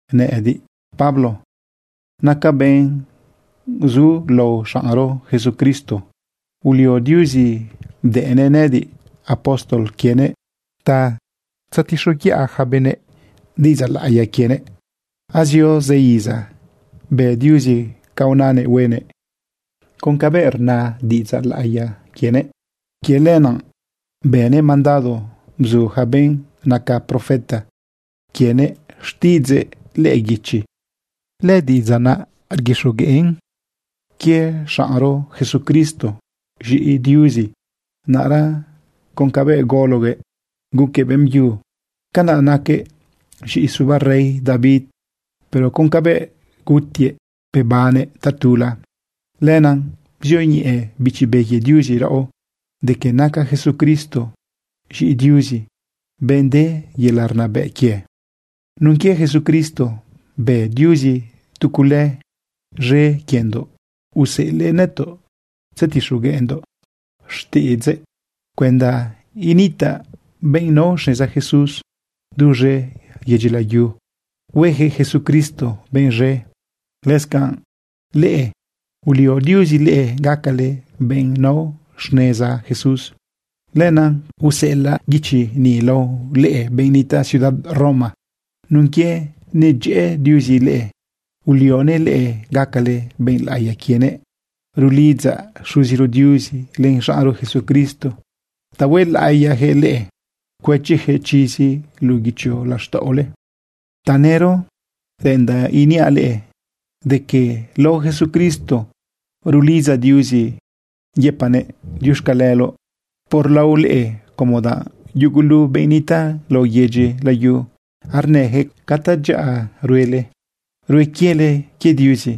Nëꞌëdiꞌ, Pablo, nacaꞌ benꞌ zulao xaꞌnro Jesucristo. Ulio Diuzi bdëꞌnëꞌ nëꞌëdiꞌ apóstol quienëꞌ ta tzetixoguiꞌa yaca benëꞌ diꞌidzaꞌ laꞌiya quienëꞌ. Azio zë iza bë Diuzi ca unanëꞌ huenëꞌ con cabëꞌ rna diꞌidzaꞌ laꞌiya quienëꞌ. Quie lenaꞌ bënëꞌ mandado bzu yaca benꞌ naca profeta quienëꞌ xtiꞌidzëꞌ lëꞌë guichi. Lëdiꞌidzaꞌ naꞌ rguixogueꞌn quie xaꞌnro Jesucristo, z̃iꞌi Diuzi. Naꞌra con cabëꞌ gologuëꞌ guquëꞌ beꞌmbyu, canaꞌ naquëꞌ z̃iꞌi suba rey David. Pero con cabëꞌ gutiëꞌ bebannëꞌ tatula, lenaꞌ bzioñeꞌe Bichi Be quie Diuzi raꞌo de que naca Jesucristo z̃iꞌi Diuzi, benꞌ de yelaꞌ rnabëꞌ quie. Nun quie Jesucristo bë Diuzi tu cule z̃e quiendoꞌ, useꞌelëꞌ nëtoꞌ tzetixogueꞌndoꞌ xtiꞌidzëꞌ cuenda gataꞌ benꞌ nao xneza Jesús duz̃e yedyi layu huejëꞌ Jesucristo benꞌ z̃e. Lëscanꞌ leꞌe, ulio Diuzi leꞌe gacale benꞌ nao xneza Jesús. Lenaꞌ useꞌelaꞌ guichi ni lao leꞌe benꞌ nitaꞌ ciudad Roma nun quie nedyëꞌë Diuzi leꞌe, ulionëꞌ leꞌe gacale benꞌ laꞌiya quienëꞌ. Rulidzaꞌ Xuziro Diuzi len xaꞌnro Jesucristo ta huelaꞌiyajëꞌ leꞌe, cuëchijëꞌ chizi luꞌu guichi laxtaꞌole. Tanëro reꞌendaꞌ iniaꞌ leꞌe de que lao Jesucristo rulidzaꞌ Diuzi yëpaꞌnëꞌ diuxcaleloꞌ por lao leꞌe, como danꞌ yugulu benꞌ nitaꞌ lao yedyi layu arnëyaquëꞌ ca tadyaꞌa ruele, rue quiele quie Diuzi.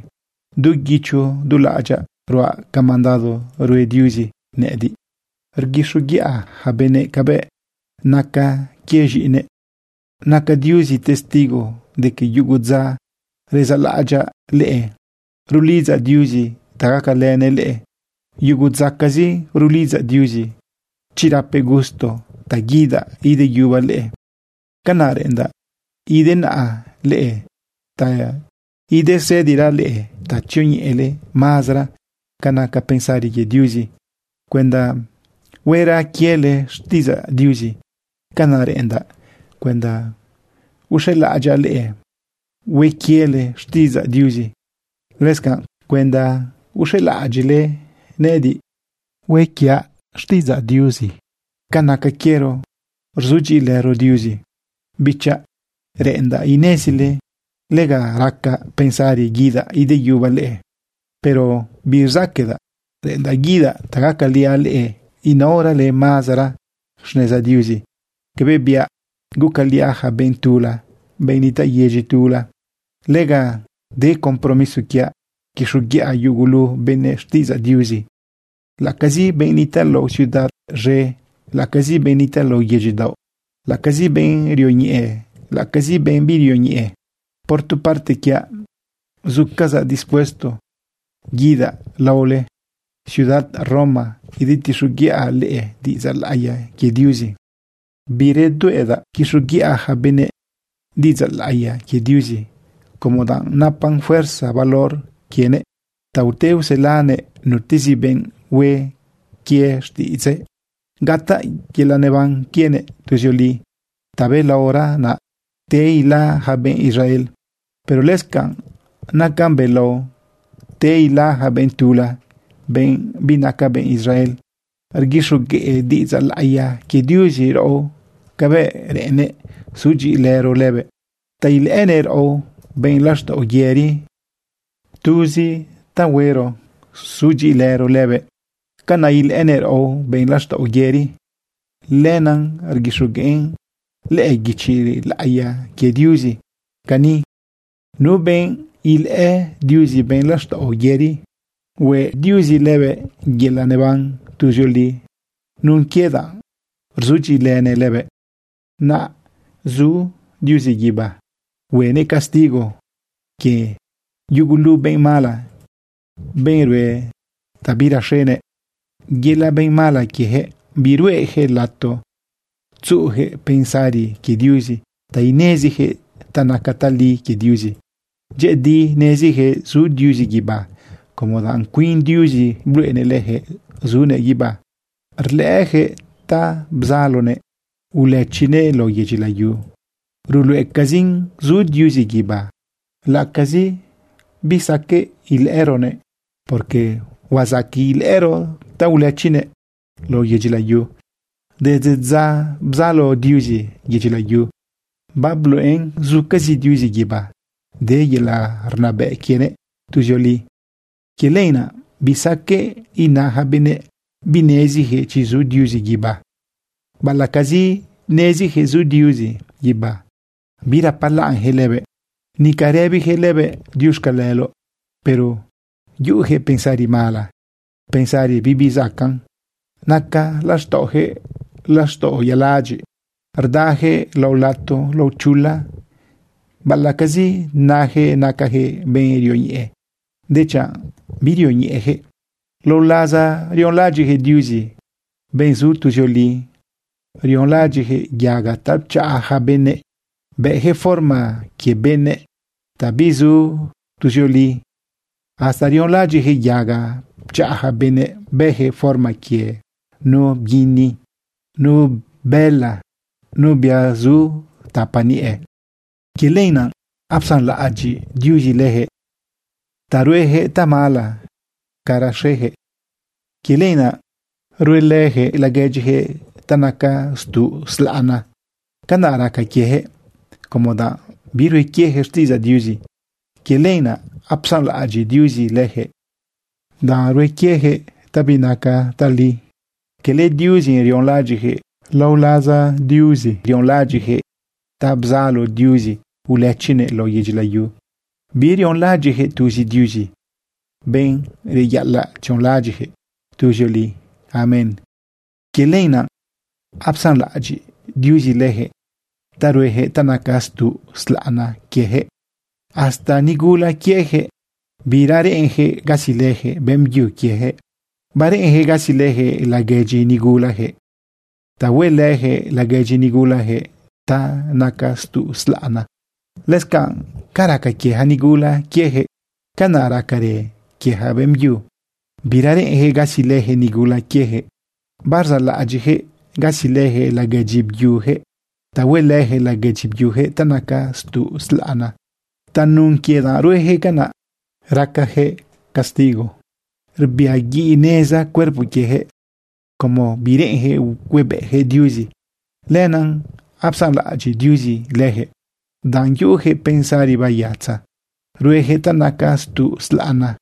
Du guicho du laꞌadyaꞌ ruaꞌ ca mandado rue Diuzi nëꞌëdiꞌ, rguixoguiꞌa yaca benëꞌ cabëꞌ naca quie z̃iꞌinëꞌ. Naca Diuzi testigo de que yugu dza rezaꞌlaꞌadyaꞌ leꞌe rulidzaꞌ Diuzi ta gacalënëꞌ leꞌe. Yugu dzacazi rulidzaꞌ Diuzi chi rapëꞌ gusto ta guidaꞌ ideyubaꞌ leꞌe. Canaꞌ reꞌendaꞌ idenaꞌa leꞌe ta idesëdiraꞌ leꞌe ta tzioñeꞌele mazara ca naca pensari quie Diuzi cuenda huera quiele xtiꞌidzaꞌ Diuzi. Canaꞌ reꞌendaꞌ cuenda uxelaꞌadyaꞌ leꞌe, hue quiele xtiꞌidzaꞌ Diuzi, lëscanꞌ cuenda uxelaꞌadyiꞌle nëꞌëdiꞌ, hue quiaꞌ xtiꞌidzaꞌ Diuzi ca naca quiero rzudyiꞌilëro Diuzi. Bichaꞌ, reꞌendaꞌ inezile lega racaꞌ pensari guidaꞌ ideyubaꞌ leꞌe pero birzaqueꞌdaꞌ. Reꞌendaꞌ guidaꞌ ta gacaliaꞌ leꞌe inaorale mazara xneza Diuzi cabëꞌ biaꞌ gucaliaꞌ yaca benꞌ tula, benꞌ nitaꞌ yedyi tula. Lega de compromiso quiaꞌ quixoguiꞌa yugulu benëꞌ xtiꞌidzaꞌ Diuzi, laꞌacazi benꞌ nitaꞌ lao ciudad z̃e, laꞌacazi benꞌ nitaꞌ lao yedyi daoꞌ, laꞌacazi benꞌ rioñeꞌe, laꞌacazi benꞌ birioñeꞌe. Por tu parte quiaꞌ, zucazaꞌ dispuesto guidaꞌ laole ciudad Roma idetixoguiꞌa leꞌe diꞌidzaꞌ laꞌiya quie Diuzi. Biredueꞌdaꞌ quixoguiꞌa ja benëꞌ diꞌidzaꞌ laꞌiya quie Diuzi, como danꞌ napan fuerza valor quienëꞌ ta ute uselanëꞌ nutezi benꞌ hue quie xtiꞌidzëꞌ gataꞌ yelaꞌ neban quienëꞌ tuzioli. Tabelaora naꞌ te ila yaca benꞌ Israel, pero lëscanꞌ nacan belao te ila yaca benꞌ tula, benꞌ binaca benꞌ Israel. Rguixogueꞌ diꞌidzaꞌ laꞌiya quie Diuzi raꞌo cabëꞌ reꞌennëꞌ sudyiꞌilëro lëbëꞌ ta ilëꞌënëꞌ raꞌo benꞌ laxtaꞌo yëri. Tuzi ta huero sudyiꞌilëro lëbëꞌ, canaꞌ ilëꞌënëꞌ raꞌo benꞌ laxtaꞌo yëri. Lenaꞌ rguixogueꞌn lëꞌë guichi laꞌiya quie Diuzi cani: “Nu benꞌ ilëꞌë Diuzi benꞌ laxtaꞌo yëri, hueꞌ Diuzi lëbëꞌ yelaꞌ neban tuzioli nun quie danꞌ rzudyiꞌilënëꞌ lëbëꞌ.” Naꞌ zu Diuzi guibá huenëꞌ castigo quie yugulu benꞌ mala, benꞌ rue ta biraxenëꞌ. Yelaꞌ benꞌ mala quiejëꞌ biruejëꞌ lato tzuꞌujëꞌ pensari quie Diuzi ta inezijëꞌ ta naca tali quie Diuzi. Dyëꞌëdi nezijëꞌ zu Diuzi guibá, como danꞌ cuin Diuzi bluꞌenëꞌ leyaquëꞌ zunëꞌ guibá rlëꞌëyaquëꞌ ta bzalonëꞌ ulëchinëꞌ lao yedyi layu. Ruluꞌecazin zu Diuzi guibá laꞌacazi bisaqueꞌ ilëꞌëroguëꞌ, porque huazaqueꞌ ilëꞌëro ta ulëchinëꞌ lao yedyi layu. Desde dza bzalo Diuzi yedyi layu, babluꞌen zucazi Diuzi guibá, de yelaꞌ rnabëꞌ quienëꞌ tuzioli. Quie lenaꞌ bisaqueꞌ ina yaca benëꞌ binezijëꞌ chi zu Diuzi guibá. Baꞌalaꞌcazi nezijëꞌ zu Diuzi guibá, birapalaꞌnjëꞌ lëbëꞌ, nica rëbijëꞌ lëbëꞌ diuxcaleloꞌ, pero yuꞌuyaquëꞌ pensari mala, pensari bibizacaꞌn. Naca laxtaꞌojëꞌ laxtaꞌo yaladyiꞌ, rdayaquëꞌ lao lato lao chula. Baꞌalaꞌcazi najëꞌ nacajëꞌ benꞌ rioñeꞌe, dechanꞌ birioñeꞌejëꞌ. Lao laza rionlaꞌadyiꞌjëꞌ Diuzi, benꞌ zu tuzioli, rionlaꞌadyiꞌjëꞌ yaga ta pchaꞌa yaca benëꞌ, bëjëꞌ forma quie benëꞌ ta bizu tuzioli. Hasta rionlaꞌadyiꞌjëꞌ yaga pchaꞌa yaca benëꞌ, bëjëꞌ forma quie nu bguini, nu bëla, nu bia zu tapa niꞌe. Quie lenaꞌ apsanlaꞌadyiꞌ Diuzi lejëꞌ ta ruejëꞌ tamala ca raxejëꞌ. Quie lenaꞌ ruelëjëꞌ laguedyijëꞌ ta naca stuꞌ slaꞌna. Canaꞌ raca quiejëꞌ, como danꞌ birue quieyaquëꞌ xtiꞌidzaꞌ Diuzi. Quie lenaꞌ apsanlaꞌadyiꞌ Diuzi lëjëꞌ ta hue quieyaquëꞌ ta binaca tali. Cala Diuzi rionlaꞌadyiꞌjëꞌ. Lao laza Diuzi, rionlaꞌadyiꞌjëꞌ ta bzalo Diuzi ulëchinëꞌ lao yedyi layu. Birionlaꞌadyiꞌjëꞌ tuzi Diuzi, benꞌ reyaꞌalaꞌ tzionlaꞌadyiꞌjëꞌ tuzioli. Amén. Quie lenaꞌ apsanlaꞌadyiꞌ Diuzi leyaquëꞌ ta rueyaquëꞌ ta naca stuꞌ slaꞌna quiejëꞌ. Hasta nigula quiejëꞌ bira reꞌenjëꞌ gasilëjëꞌ beꞌmbyu quiejëꞌ. Bareꞌenjëꞌ gasilëjëꞌ laguedyi nigulajëꞌ ta huelëjëꞌ laguedyi nigulajëꞌ ta naca stuꞌ slaꞌna. Lëscanꞌ ca raca quie yaca nigula quiejëꞌ, canaꞌ racarë quie yaca beꞌmbyu. Bira reꞌenjëꞌ gasilëjëꞌ nigula quiejëꞌ. Barzaꞌlaꞌadyiꞌjëꞌ gasilëjëꞌ laguedyi byujëꞌ ta huelëjëꞌ laguedyi byujëꞌ ta naca stuꞌ slaꞌna. Tanun quie ruejëꞌ canaꞌ, racajëꞌ castigo rbiaguiꞌneza cuerpo quiejëꞌ. Como bireꞌenyaquëꞌ huebëꞌyaquëꞌ Diuzi, lenaꞌ apsanlaꞌadyiꞌ Diuzi leyaquëꞌ ta yuꞌuyaquëꞌ pensari bayatza rueyaquëꞌ ta naca stuꞌ slaꞌna.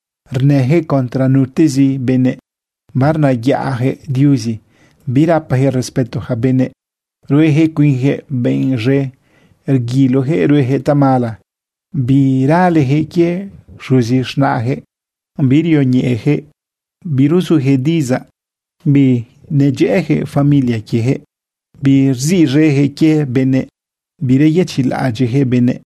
Rnëjëꞌ contra nutezi benëꞌ, barnayaꞌjëꞌ Diuzi, birapajëꞌ respeto yaca benëꞌ, ruejëꞌ cuinjëꞌ benꞌ z̃e, rguilojëꞌ ruejëꞌ tamala, biralejëꞌ quie xuzi z̃naꞌjëꞌ. Birioñeꞌejëꞌ biruzujëꞌ diꞌidzaꞌ, binedyëꞌëjëꞌ familia quiejëꞌ, birziꞌz̃ejëꞌ quie benëꞌ, bireyëchiꞌlaꞌadyiꞌjëꞌ benëꞌ.